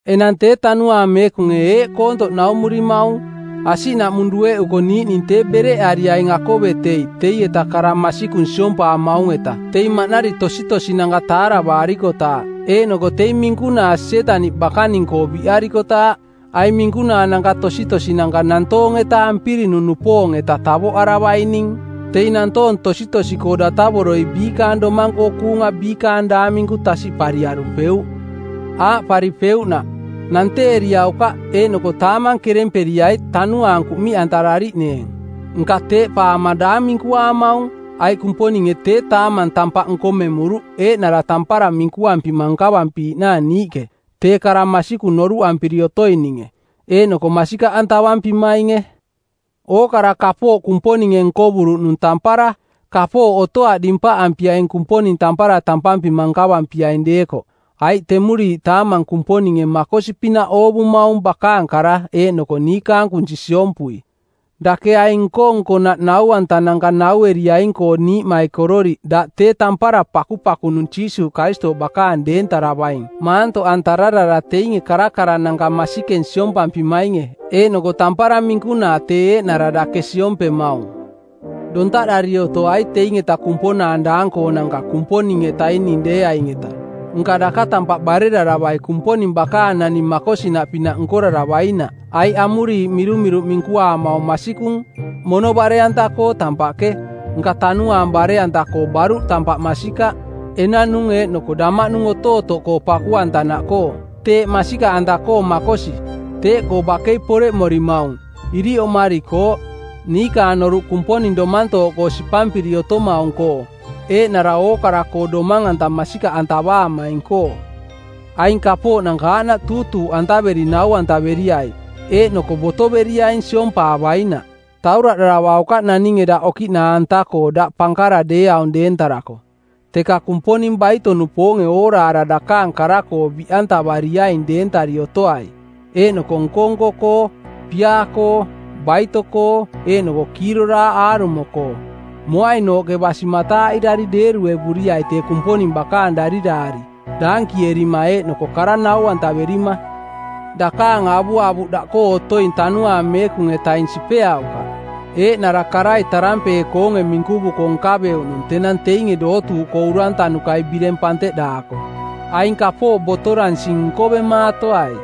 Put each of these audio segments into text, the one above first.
Enang tee Tanuaang Meekunge eeꞌ koontoꞌ naumurimaung: Asiꞌnaꞌmung dueꞌuko niiꞌning tee bereꞌariaing akovetei teieta kara masikung siompampimaung-eta teing maꞌnari tositosinanka taaravaari-kotaaꞌ, eeꞌnoko teing minkunaa Sietaniꞌ bakaning-koo biꞌarikotaaꞌ. Aing minkunaananka tositosinanka nantoong-eta ampirinung-nupoong-eta tavoꞌaravaining. Teing nantoong tositosi-koo datavoroi biikaang domang-koo kuunga biikaang daang minku tasiꞌpariarupeuꞌ. Aaꞌparipeuꞌnaꞌ: “Nanteeriaukaꞌ eeꞌnoko taamang keremperiai tanuaang kuꞌmiꞌantarariꞌneeng.” Nka teeꞌpaama daang minkuaamaung, aiꞌ Kumponinge tee taamang tampaꞌ nkomemuruꞌ eeꞌnara tampara minkuampima nkavampiiꞌnaang niiꞌke, tee kara masikung noruꞌampiri otoininge, eeꞌnoko masikaꞌantavampimainge. Ookara kapooꞌ Kumponinge nkovuruꞌnung tampara, kapooꞌ otoaꞌ dimpaꞌampiaing Kumponing tampara tampampima nkavampiaing deekoꞌ, aiꞌ temuriiꞌ taamang Kumponinge makosi-pinaꞌ oovumaung bakaang kara eeꞌnoko niikaang kunsi siompui. Dake aing nko-nkonaꞌ nau-antananka naueriaing-koo niiꞌmaikororiꞌ daꞌ tee tampara pakupakunung Jiisuuꞌ Karistooꞌ bakaang deentaravaing maantoꞌantararara teinge karakarananka masikeng siompampimainge eeꞌnoko tampara minkunaa tee eeꞌnara dake siompemaung. Dontaꞌdari otoai teing-eta kumponaang daang-koonanka Kumponing-etaning deeaing-eta. Nka daka tampaꞌ bareraravai Kumponing bakaang naning makosinaꞌpinaꞌ nkoraravainaꞌ. Aiꞌ amuriiꞌ mirumiruꞌ minkuaamaung masikung: “Mono bare-anta-koo tampaꞌke, nka tanuaang bare-anta-koo baruꞌ tampaꞌ masikaꞌ, enanung eeꞌnoko damaꞌnung otootoꞌkoo paku-antanaꞌkoo.” Teeꞌ masikaꞌanta-koo makosi. Teeꞌkoo bakei poreꞌmorimaung, iriꞌ oꞌmarikooꞌ, niikaang noruꞌ Kumponing domantooꞌkoo sipampiri otomaung-koo, eeꞌnara ookara-koo Domang-anta masikaꞌantavaamaing-koo. Aing kapooꞌnanka aaꞌnaꞌ tuutuuꞌantaveri nau-antaveriai, eeꞌnoko botoveriaing siompaavainaꞌ. Tauraꞌdaravaukaꞌ naninge daꞌ okiꞌnaa-anta-koo daꞌ pankara deeaung deentarako, teka Kumponing baito-nupoonge ooraara dakaang kara-koo biꞌantavariaing deentari otoai, eeꞌnoko nko-nko-koo, piaa-koo, baito-koo eeꞌnoko kiiroraaꞌ aarumo-koo. Moainooꞌke basi mataaꞌirari deeruevuriai tee Kumponing bakaang dariraari, daankierima eeꞌnoko kara nau-antaverima. Dakaang avuavuꞌ daꞌkoo otoing Tanuaang Meekung-etaing sipeaukaꞌ, eeꞌnara karai tarampee˜koonge minkuvuko nkaveuꞌnung tenang teinge dootuuꞌkoo urantanukai bireng panteꞌdaako. Aing kapooꞌ botoransing nkoemaatoai.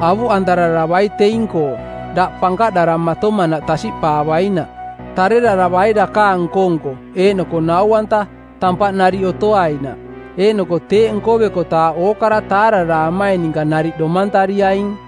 Avuꞌantararavai teing-koo, daꞌ pankaꞌdaramatomanaꞌ tasiꞌpaavainaꞌ. Tareraravai dakaang nko-nko eeꞌnoko nau-anta, tampaꞌ nariꞌ otoainaꞌ, eeꞌnoko teeꞌ nkovekotaaꞌ ookara taararaamaing ninka nariꞌ domantariaing.